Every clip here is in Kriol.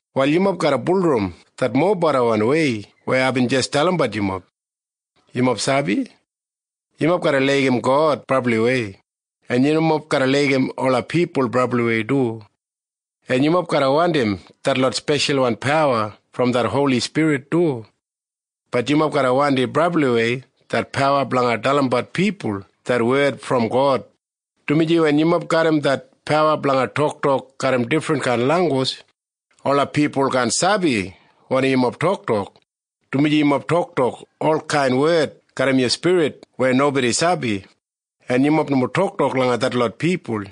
Wal yumob garra bulurrum det mobedawan wei weya aibin jis dalimbat yumob. Yumob sabi? Yumob garra laigim God brabliwei, en yumob garra laigim ola pipul brabliwei du. En yumob garra wandim detlot speshalwan pawa brom det Holi Spirit du. Bat yumob garra wandim brabliwei det pawa blanga dalimbat pipul det wed brom God, dumaji wen yumob garram det pawa blanga toktok garram difrinkain langgus, ola pipul kaan sabi wanim yumob toktok, dumaji yu toktok olkain wed garram yu spirit weya nobodi sabi, en yumob nomo toktok langa detlot pipul.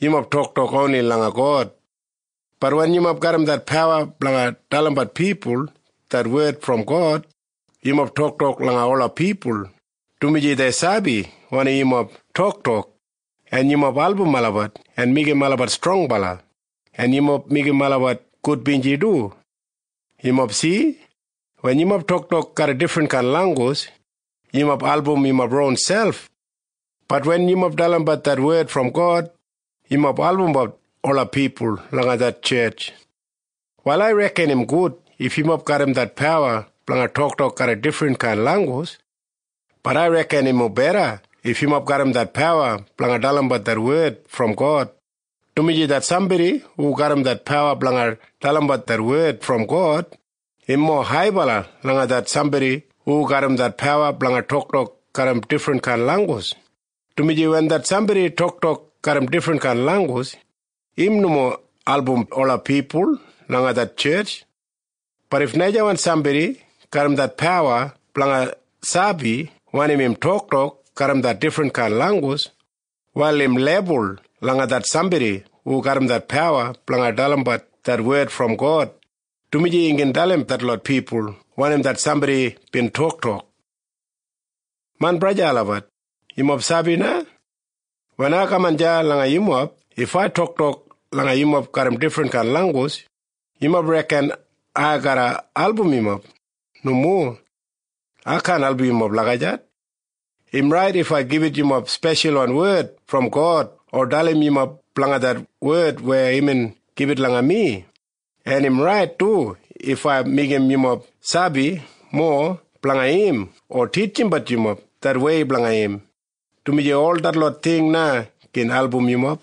Yumob toktok oni langa God. Bat wen yumob garram det pawa blanga dalimbat pipul det wed brom God, yumob toktok langa ola pipul, dumaji dei sabi wanim yumob toktok, en yumob album olabat en meigim olabat strongbala, en yumob meigim olabat gudbinji du. Yumob si? Wen yumob toktok garram difrinkain langgus, yumob albumbat yu ronselp. Bat wen yu dalimbat det wed brom God, yumob albumbat ola pipul langa det tjetj. Wal ai reken im gud if yumob garram det pawa blanga toktok garram difrinkain langgus. Bat ai reken im mobeda if yumob garram det pawa blanga dalimbat det wed brom God, dumaji det sambodi hu garram det pawa blanga dalimbat det wed brom God, im mowa haibala langa det sambodi hu garram det pawa blanga toktok garram difrinkain langgus, dumaji wen det sambodi toktok garram difrinkain langgus, im nomo album ola pipul langa det tjetj. Bat if najawan sambodi garram det pawa blanga sabi wanim imbin toktok garram det difrinkain langgus, wal im lebul langa det sambodi hu garram det pawa blanga dalimbat det wed brom God, dumaji im gin dalim detlot pipul wanim det sambodi bin toktok. Main braja en sista olabat, yumob sabi na? Wen ai kaman deya langa yumob, if ai toktok langa yumob garram difrinkain langgus, yumob reken ai garra album yumob? Nomo. Ai kaan album yumob lagijat. Im rait if ai gibit yumob speshalwan wed brom God o dalim yumob blanga det wed weya imbin gibit langa mi, en im rait du if ai meigim yumob sabi mowa blanga im o titjimbat yumob det wei blanga im, dumaji ol detlot ting na gin album yumob.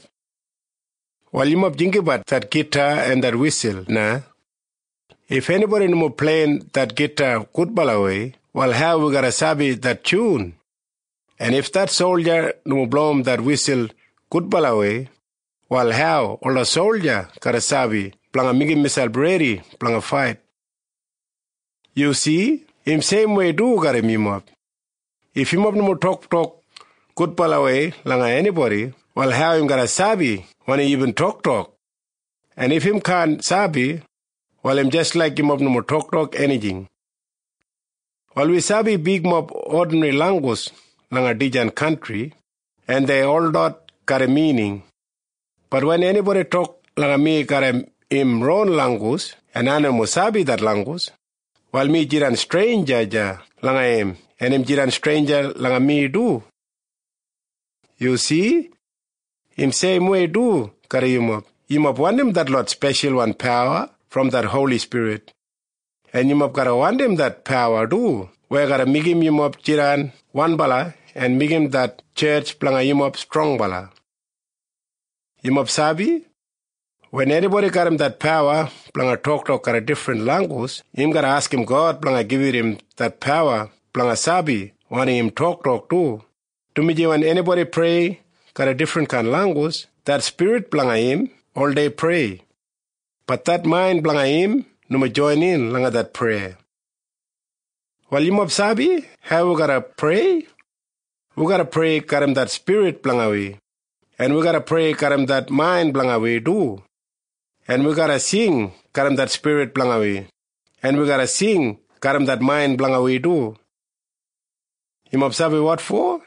Wal yumob jinggabat det gita en det wisul na. If enibodi nomo pleiyim det gita gudbalawei, wal hau wi garra sabi det tyun? En if det solja nomo blowim det wisul gudbalawei, wal hau ola solja garra sabi blanga meigim miselp redi blanga fait? Yu si? Im seimwei du garram yumob. If yumob nomo toktok gudbalawei langa enibodi, wal hau im garra sabi wanim yumob toktok? En if im kaan sabi, wal im jis laik yumob nomo toktok enijing. Wal wi sabi bigmob odinri langgus langa dijan kantri, en dei holot garram mining. Bat wen enibodi tok langa mi garram im ron langgus, en ai nomo sabi det langgus, wal mi jidan streinja langa im, en im jidan streinja langa mi du. Yu si? Im seimwei du garram yumob. Yumob wandim detlot speshalwan pawa brom det Holi Spirit. En yumob garra wandim det pawa du weya garra meigim yumob jidan wanbala en meigim det tjetj blanga yumob strongbala. Yumob sabi? Wen enibodi garram det pawa blanga toktok garram difrinkain langgus, im garra askim God blanga gibit im det pawa blanga sabi wanim im toktok du, dumaji wen enibodi prei garram difrinkain langgus, det spirit blanga im oldei prei. Bat det main blanga im nomo joinin langa det preya. Wal yumob sabi hau wi garra prei? Wi garra prei garram det spirit blanga wi, en wi garra prei garram det main blanga wi du. En wi garra sing garram det spirit blanga wi, en wi garra sing garram det main blanga wi du. Yumob sabi wotfo?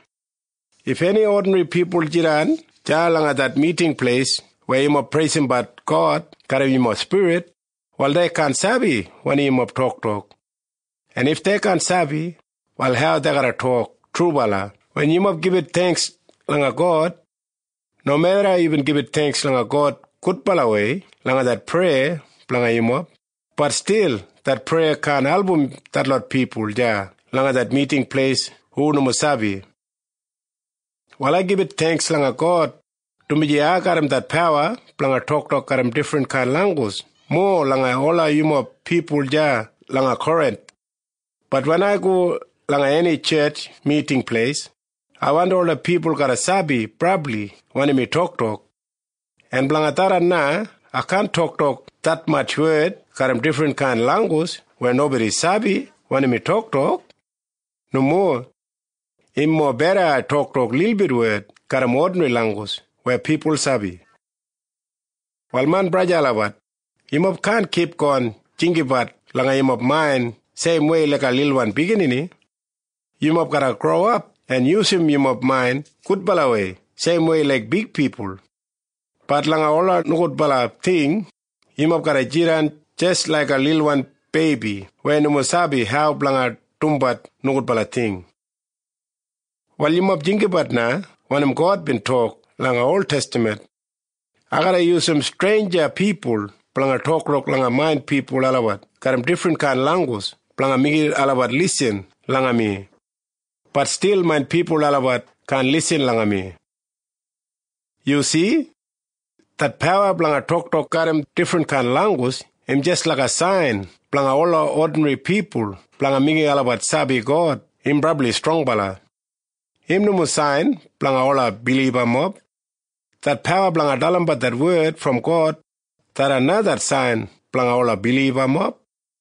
If eni odinri pipul jidan deya langa det miting pleis weya yumob preisimbat God garram yumob spirit, wal dei kaan sabi wanim yumob toktok. En if dei kaan sabi, wal hau dei garra tok “Trubala” wen yumob gibit theingks langa God? Nomeda yumob gibit theingks langa God gudbalawei langa det preya blanga yumob, bat stil det preya kaan album detlot pipul deya langa det miting pleis hu nomo sabi. Wal ai gibit theingks langa God, dumaji ai garram det pawa blanga toktok garram difrinkain langgus mowa langa ol yumob pipul deya langa Korinth. Bat wen ai go langa eni tjetj miting pleis, ai wandim ola pipul garra sabi brabli wanim mi toktok. En blanga tharran na ai kaan toktok detmatj wed garram difrinkain langgus weya nobodi sabi wanim mi toktok. Nomo. Im mobeda ai toktok lilbit wed garram odinri langgus weya pipul sabi. Wal main braja en sista olabat, yumob kaan kipgon jinggabat langa yumob main seimwei laiga lilwan biginini. Yumob garra growap en yusum yumob main gudbalawei seimwei laik big pipul. Bat langa ola nogudbala ting, yumob garra jidan jis laiga lilwan beibi weya nomo sabi hau blanga dumbat nogudbala ting. Wal yumob jinggabat na wanim God bin tok langa oltestaman, “Ai garra yusum streinja pipul blanga toktok langa main pipul olabat garram difrinkain langgus blanga meigim olabat lisin langa mi. Bat stil main pipul olabat kaan lisin langa mi.” Yu si? Det pawa blanga toktok garram difrinkain langgus im jis laiga sain blanga ola odinri pipul blanga meigim olabat sabi God im brabli strongbala. Im nomo sain blanga ola bilibamob. Det pawa blanga dalimbat det wed brom God, tharran na det sain blanga ola bilibamob.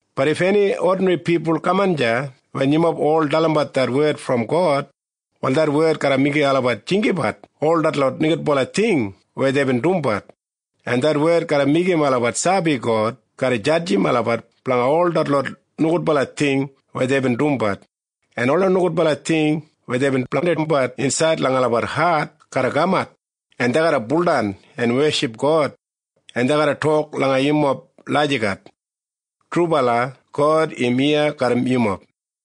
Bat if eni odinri pipul kaman deya wen yumob ol dalimbat det wed brom God, wal det wed garra meigim olabat jinggabat ol detlot nogudbala ting weya deibin dumbat, en det wed garra meigim olabat sabi God garra jadjim olabat blanga ol detlot nogudbala ting weya deibin dumbat, en ola nogudbala ting weya deibin blandimbat insaid langa olabat hat garra kamat, en dei garra baudan en weship God, en dei garra tok langa yumob lagijat, “Trubala, God im iya garram yumob.”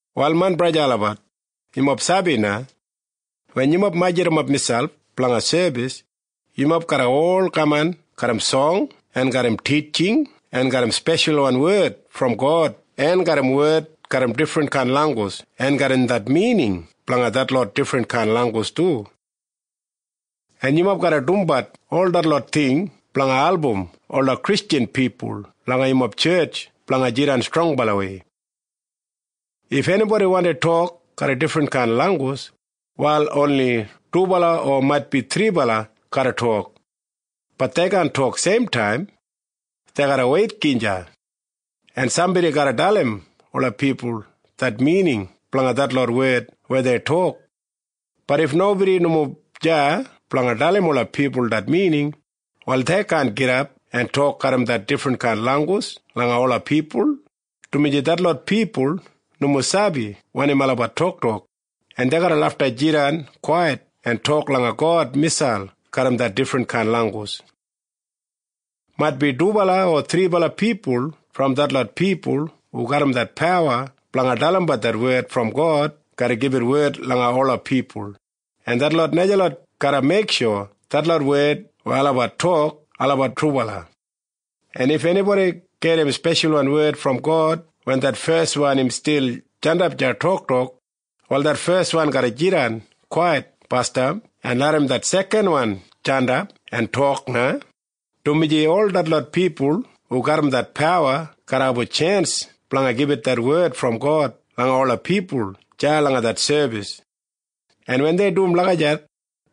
Wal main braja en sista olabat, yumob sabi na? Wen yumob majurrumap miselp blanga sebis, yumob garra ol kaman garram song en garram titjing en garram speshalwan wed brom God en garram wed garram difrinkain langgus en garram det mining blanga detlot difrinkain langgus du. En yumob garra dumbat ol detlot ting blanga album ola Kristjan pipul langa yumob tjetj blanga jidan strongbalawei. If enibodi wandi tok garram difrinkain langgus, wal oni dubala o maitbi thribala garra tok. Bat dei kaan tok seimtaim. Dei garra weit gija. En sambodi garra dalim ola pipul det mining blanga detlot wed weya dei tok. Bat if nobodi nomo deya blanga dalim ola pipul det mining, wal dei kaan gidap en tok garram det difrinkain langgus langa ola pipul, dumaji detlot pipul nomo sabi wanim olabat toktok, en dei garra lafta jidan kwait en tok langa God miselp garram det difrinkain langgus. Maitbi dubala o thribala pipul brom detlot pipul hu garram det pawa blanga dalimbat wed brom God garra gibit wed langa ola pipul, en detlot najalot garra meiksho detlot wed weya olabat tok olabat trubala. En if enibodi gedim speshalwan wed brom God wen det feswan im stil jandap deya toktok, wal det feswan garra jidan kwait basdam en larram det sekanwan jandap en tok na, dumaji ol detlot pipul hu garram det pawa garra abum tjens blanga gibit wed brom God langa ola pipul deya langa det sebis. En wen dei dum lagijat,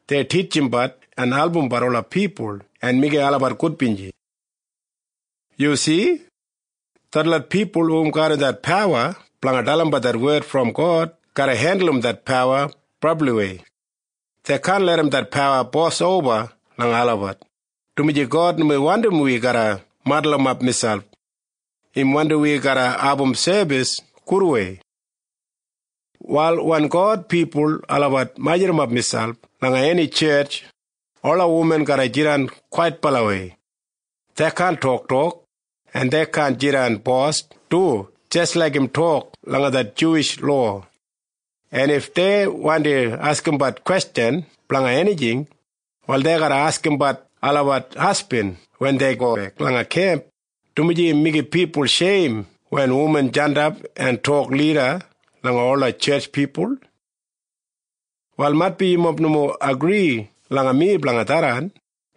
dei titjimbat en albumbat ola pipul en meigim olabat gudbinji. Yu si? Detlot pipul hu garram det pawa blanga dalimbat wed brom God garra hendulum det pawa brabliwei. Dei kaan larram det pawa bosoba langa olabat, dumaji God nomo wandi wi garra madulumap miselp. Im wandi wi garra abum sebis gudwei. Wal wen God pipul olabat majurrumap miselp langa eni tjetj, ola wuman garra jidan kwaitbalawei. Dei kaan toktok, en dei kaan jidan bos du jis laik im tok langa det Juwish lowa. En if dei wandi askimbat kwestjan blanga enijing, wal dei garra askimbat olabat hasbin wen dei gobek langa kemp, dumaji im meigim pipul sheim wen wuman jandap en tok lida langa ola tjetj pipul. Wal maitbi yumob nomo agri langa mi blanga tharran,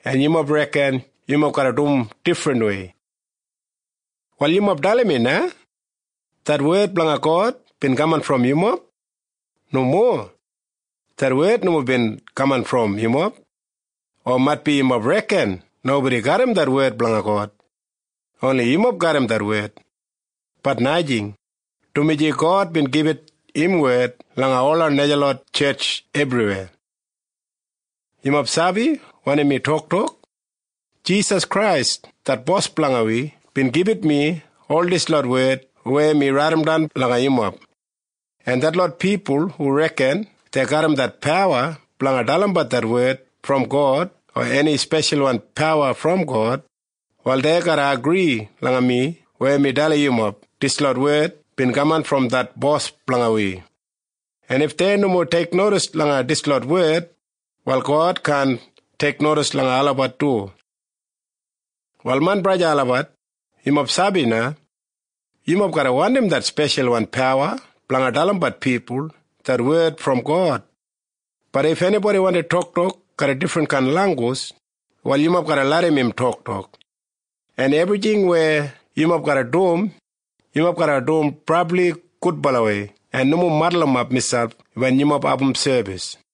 en yumob reken yumob garra dum difrinwei. Wal yumob dalim mi na. Det wed blanga God bin kamat brom yumob? Nomo. Det wed nomo bin kamat brom yumob. O maitbi yumob reken nobodi garram det wed blanga God. Oni yumob garram det wed. Bat najing, dumaji God bin gibit im wed langa ola najalot tjetj ebriweya. Yumob sabi wanim mi toktok? Jisas Krais det Bos blanga wi bin gibit mi ol dislot wed weya mi raidimdan langa yumob. En detlot pipul hu reken dei garram det pawa blanga dalimbat det wed brom God o eni speshalwan pawa brom God, wal dei garra agri langa mi weya mi dalim yumob dislot wed bin kamat brom det Bos blanga wi. En if dei nomo teiknodis langa dislot wed, wal God kaan teiknodis langa olabat du. Wal main braja en sista olabat, yumob sabi na? Yumob garra wandim det speshalwan pawa blanga dalimbat pipul det wed brom God. Bat if enibodi wandi toktok garram difrinkain langgus, wal yumob garra larram im toktok. En ebrijing weya yumob garra dum, yumob garra dum brabli gudbalawei en nomo madulumap miselp wen yumob abum sebis.